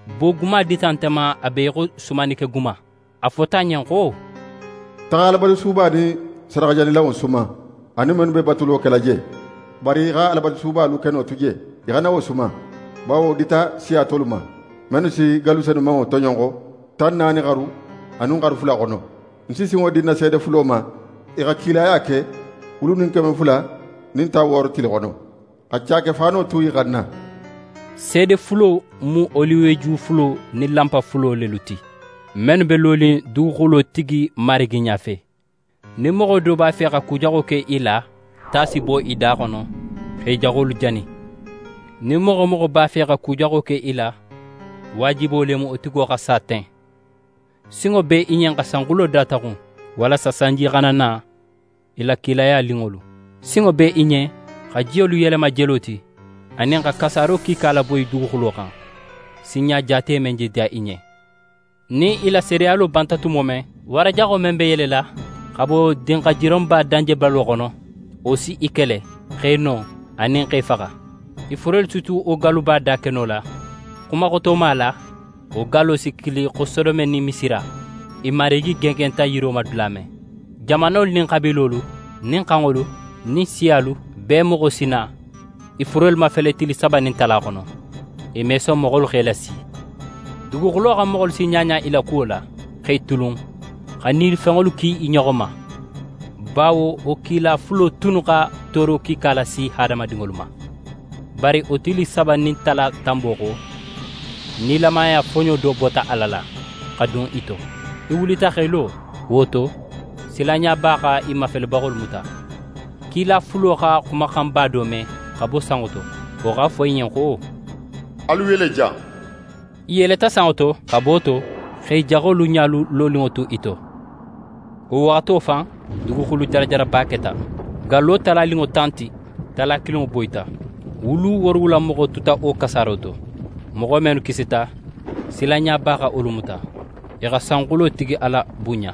Boguma dita nte ma a be í xo sumannikeguma. A fota ń ɲen xo: «Taxa Alabatusuba nin sadaxajanilanŋo suman anin mennu be batulo kela je. Bari í xa Alabatusuba lukeno tu je, í xana wo suman, bawo wo dita siya tolu ma, mennu si gallu senumanŋo toɲonxo, tan naani xaru anin xaru fula xono. Ń si sinŋo di ń na seede fulo ma, i xa kilaya ke wulu nin keme fula nin tan wooro tili xono, xa caake faano tu i xanna.» Seede fulo mu oliweju fulo nin lanpa fulo lelu ti, mennu be lonin duguxulotigi Marigi ɲafe. Nin moxo do b'a fe xa ku jaxo ke i la, ta si bo i da xono x'e jaxolu jani. Nin moxo wo moxo b'a fe xa ku jaxo ke i la, waajibo le mu wo tigo xa sa ten. Sinŋo be i ɲen xa sanxulo dataxun walasa sanji xana na i la kilaya lunŋolu. Sinŋo be i ɲen xa jiyolu yelema jelo ti, anin xa kasaaro kiika laboyi duguxulo xan, sinɲa jaate men je diya i ɲen. Nin i la seedeyalo banta tumo men, wara jaxo men be yelela xa bo dinxajironba danjebalo xono, wo si i kele, x'e no, anin x'e faxa. I furelu si tu wo galluba dakeno la. Xumaxotoma la, wo gallo si kili xo Sodome nin Misira, i Marigi gengenta yiro ma dula men. Jamanolu nin xabiilolu nin xanŋolu nin siyalu bee moxo si na i furelu mafele tili saba nin tala xono. I me son moxolu x'e lasi. Duguxulo xan moxolu si ɲaɲa i la kuwo la, x'e tulun, xa nilifenŋolu ki i ɲoxo ma, bawo wo kila fulo tunnu xa tooro kiika lasi hadamadinŋolu ma. Bari wo tili saba nin tala tanbo xo, nilamaya foɲo do bota Ala la, xa dun i to. I wulita x'e lo. Wo to, silanɲaba xa i mafelebaxolu muta. Kila fulo xa xumaxanba do me xa bo sanŋo to, wo x'a fo i ɲen xo: «Alu yele jan.» I yeleta sanŋo to, xabo to, x'e jaxolu ɲalu loninŋo tu i to. Wo waxato fan, duguxulu jarajaraba keta, gallo talaninŋo tan ti, tala kilinŋo boyita, wulu woorowula moxo tuta wo kasaaro to. Moxo mennu kisita, silanɲaba xa wolu muta, i xa sanxulotigi Ala bunɲa.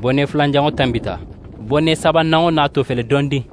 Bone fulananŋo tanbita. Bone sabananŋo nato fele dondin.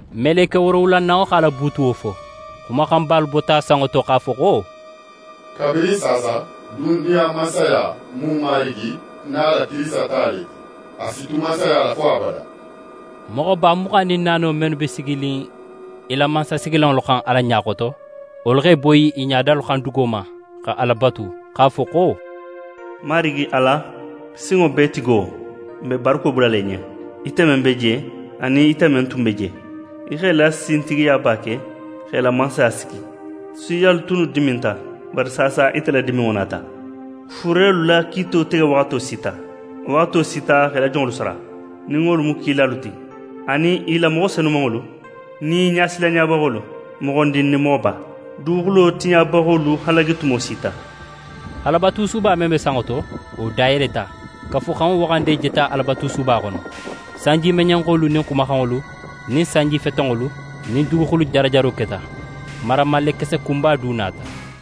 Meleke woorowulananŋo x'a la buutuwo fo. Xumaxanbalu bota sanŋo to x'a fo xo: «Kabirin saasa, duniya mansaya mu n Marigi nin a la Kirisita ta le ti, a si tu mansaya la fo abada!» Moxoba muxan nin naano mennu be siginin i la mansasigilanŋolu xan Ala ɲa xoto, wolu x'e boyi i ɲadalu xan dugo ma, xa Ala batu, x'a fo xo: «Marigi Ala, Sinŋobeetigo, n be barako bulala í ɲen, ite men be je, anin ite men tun be je, í x'é la sintigiyaba ke, x'é la mansaya sigi. Siyalu tunnu diminta, bari saasa ite la diminŋo nata. Furelu la kiito tege waxato sita. Waxato sita xa í la jonŋolu sara, nin wolu mu kilalu ti, anin i la moxo senumanŋolu nin í ɲasilanɲabaxolu, moxondin nin moxoba. Duguxulo tiɲabaxolu halagi tumo sita.» Alabatusuba men be sanŋo to, wo dayeleta, Kafuxanŋo waxande jeta Alabatusuba xono. Sanjimeɲenxolu nin xumaxanŋolu nin sanjifetenŋolu nin duguxulu jarajaro keta. Maramallekese kunba du nata.